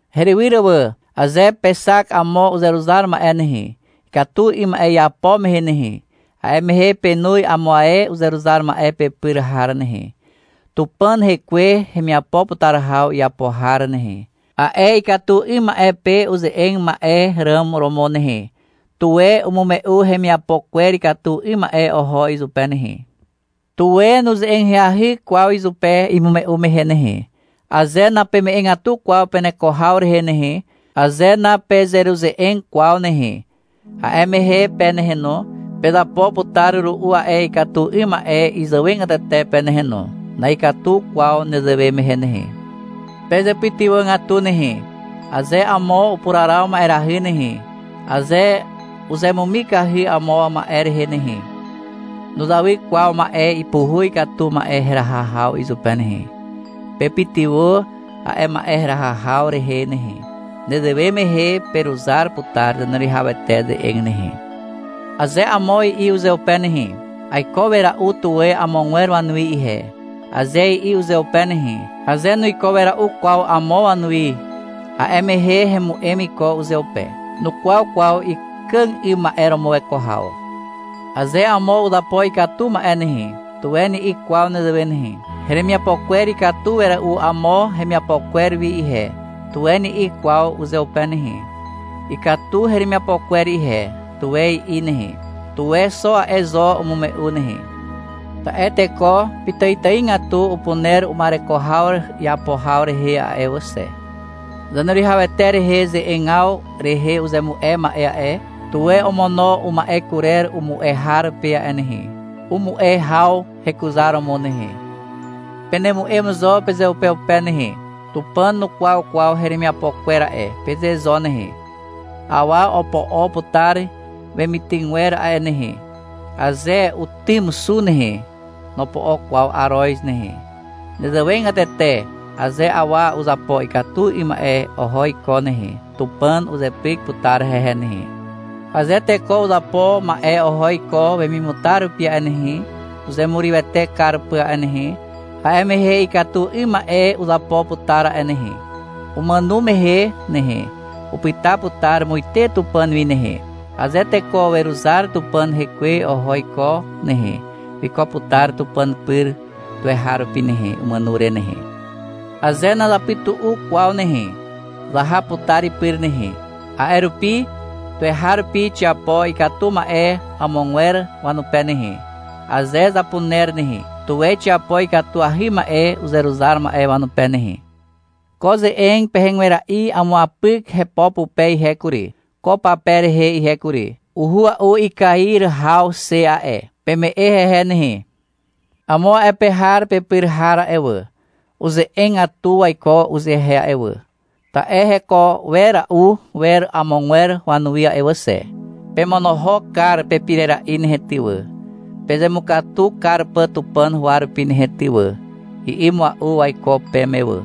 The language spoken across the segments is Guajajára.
Herywyr wà, aze pexak amo uzeruzar ma'e nehe, ikatu 'ym ma'e iapo mehe nehe, a'e mehe penoz amo ae uzeruzar ma'e pepyr har nehe, Tupàn Hekwe hemiapo putar haw iapo har nehe, a'e ikatu 'ym ma'e pe uze'eg ma'e ràm romo nehe. Tuwe umume'u hemiapo kwer ikatu 'ym ma'e oho izupe nehe. Tuwe nuze'eg ahyahy kwaw izupe imume'u mehe nehe. Aze napeme'egatu kwaw peneko haw rehe nehe, aze napezeruze'eg kwaw nehe, a'e mehe pe nehe no, pezapo putar ru'u a'e ikatu 'ym ma'e izàwegatete pe nehe no. Na'ikatu kwaw nezewe mehe nehe. Pezepytywàgatu nehe. Aze amo upuraraw ma'erahy nehe, aze uzemumikahy amo ma'e rehe nehe, nuzawy kwaw ma'e ipuhuz katu ma'e heraha haw izupe nehe. Pepytywà a'e ma'e heraha haw rehe nehe. Nezewe mehe peruzar putar Zaneruwihawete ze'eg nehe. Aze amo i'i uzeupe nehe. — Aiko wera'u tuwe amogwer wanuwi ihe, aze i'i uzeupe nehe, aze nuiko wera'u kwaw amo wanuwi, a'e mehe hemu'em iko uzeupe. Nukwaw kwaw ikàg 'ym ma'e romo weko haw. Aze amo uzapo ikatu ma'e nehe, tuwe ni'i kwaw nezewe nehe. — Heremiapo kwer ikatu wera'u amo hemiapo kwer wi ihe, tuwe ni'i kwaw uzeupe nehe. — Ikatu heremiapo kwer ihe, tuwe i'i nehe. Tuwe xo a'e zo umume'u nehe. Ta'e teko pitàitàigatu upuner uma'ereko haw iapo haw rehe a'e wà xe. Zaneruwihawete rehe ze'egaw rehe uzemu'e ma'e a'e, tuwe omono uma'e kurer umu'e har pe a'e nehe, umu'e haw hekuzaromo nehe. Penemu'em zo pezeupeupe nehe. — Tupàn nukwaw kwaw heremiapo kwer a'e, peze zo nehe. Awa opo'o putar wemitygwer a'e nehe. Aze utym xu nehe, nopo'o kwaw aroz nehe. Nezewegatete aze awa uzapo ikatu 'ym ma'e oho iko nehe, Tupàn uzepyk putar hehe nehe. Aze teko uzapo ma'e oho iko wemimutar rupi a'e nehe, uzemurywete kar pà a'e nehe, a'e mehe ikatu 'ym ma'e uzapo putar a'e nehe. Umàno mehe nehe, upyta putar muite Tupàn wi nehe. Aze teko weruzar Tupàn Hekwe oho iko nehe, wiko putar Tupàn pyr tuweharupi nehe, umàno re nehe. Aze nazapytu'u kwaw nehe, zaha putar ipyr nehe. A'e rupi tuweharupi xiapo ikatu ma'e amogwer wanupe nehe, aze zapuner nehe. Tuwe xiapo ikatuahy ma'e uzeruzar ma'e wanupe nehe. Ko ze'eg pehegwera'i amuapyk hepo pupe ihe kury, ko pape rehe ihe kury. Uhua'u ikair haw xe a'e. Peme'e hehe nehe. Amo a'e pe har pepyr har a'e wà, uze'egatu waiko uzehe a'e wà, ta'e heko wera'u wer amogwer wanuwi a'e wà xe. — Pemonohok kar pepirera'i nehe ty wà, pezemukatu kar pà Tupàn huwa rupi nehe ty wà, i'i mua'u waiko peme wà.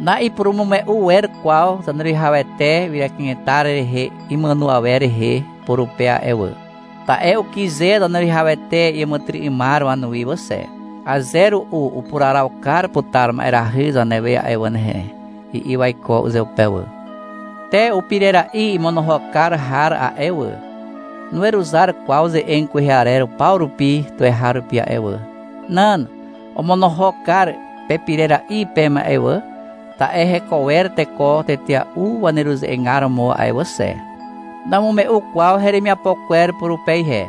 Na'ipurumume'u wer kwaw Zaneruwihawete ywyra kanetar rehe imàno awer rehe purupe a'e wà. Ta'e ukyze Zaneruwihawete iàmàtyry'ymar wanuwi wà xe. — Aze ru'u upuraraw kar putar ma'erahy zanewe a'e wà nehe, i'i waiko uzeupe wà. Te upirera'i imonohok kar har a'e wà, nuweruzar kwaw ze'eg kwehe arer paw rupi tuweharupi a'e wà. Nan. Omonohok kar pepirera'i peme a'e wà, ta'e heko wer teko tetea'u waneruze'egar romo a'e wà xe. Namume'u kwaw heremiapo kwer purupe ihe.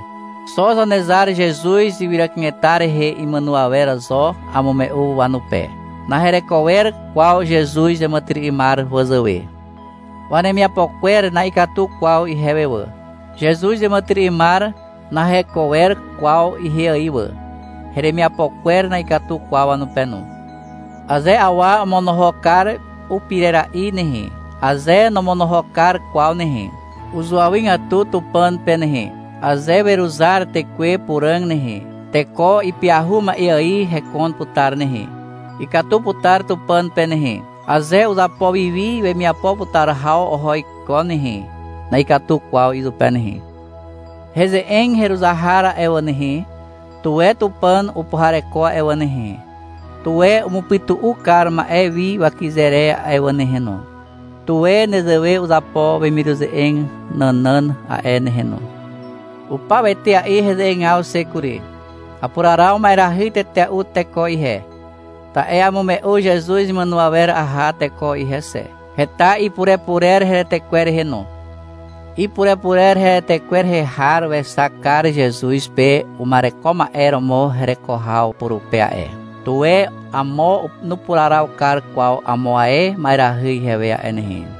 Xo Zanezar Zezuz ywyra kanetar rehe imàno awer zo amume'u wanupe. Nahereko wer kwaw Zezuz iàmàtyry'ymar wazàwe. Wanemiapo kwer na'ikatu kwaw ihewe wà. Zezuz iàmàtyry'ymar naheko wer kwaw ihe ài wà. Heremiapo kwer na'ikatu kwaw wanupe no. Aze awa omonohok kar upirera'i nehe, aze nomonohok kar kwaw nehe, uzuawygatu Tupàn pe nehe. Aze weruzar Tekwe Puràg nehe, teko ipyahu ma'e ài hekon putar nehe. Ikatu putar Tupàn pe nehe. Aze uzapo wi wi wemiapo putar haw oho iko nehe, na'ikatu kwaw izupe nehe. Heze'eg heruzar har a'e wà nehe, tuwe Tupàn upuhareko a'e wà nehe, tuwe umupytu'u kar ma'e wi wakyze re a'e wà nehe no. Tuwe nezewe uzapo wemiruze'eg nànàn a'e nehe no. Upaw etea'i heze'egaw xe kury. Apuraraw ma'erahy tetea'u teko ihe, ta'e amume'u Zezuz imàno awer aha teko ihe xe. Heta ipurepurer heretekwer rehe no. Ipurepurer heretekwer rehe har wexak kar Zezuz pe uma'ereko ma'e romo hereko haw purupe a'e. Tuwe amo nupuraraw kar kwaw amo ae ma'erahy ihewe a'e nehe.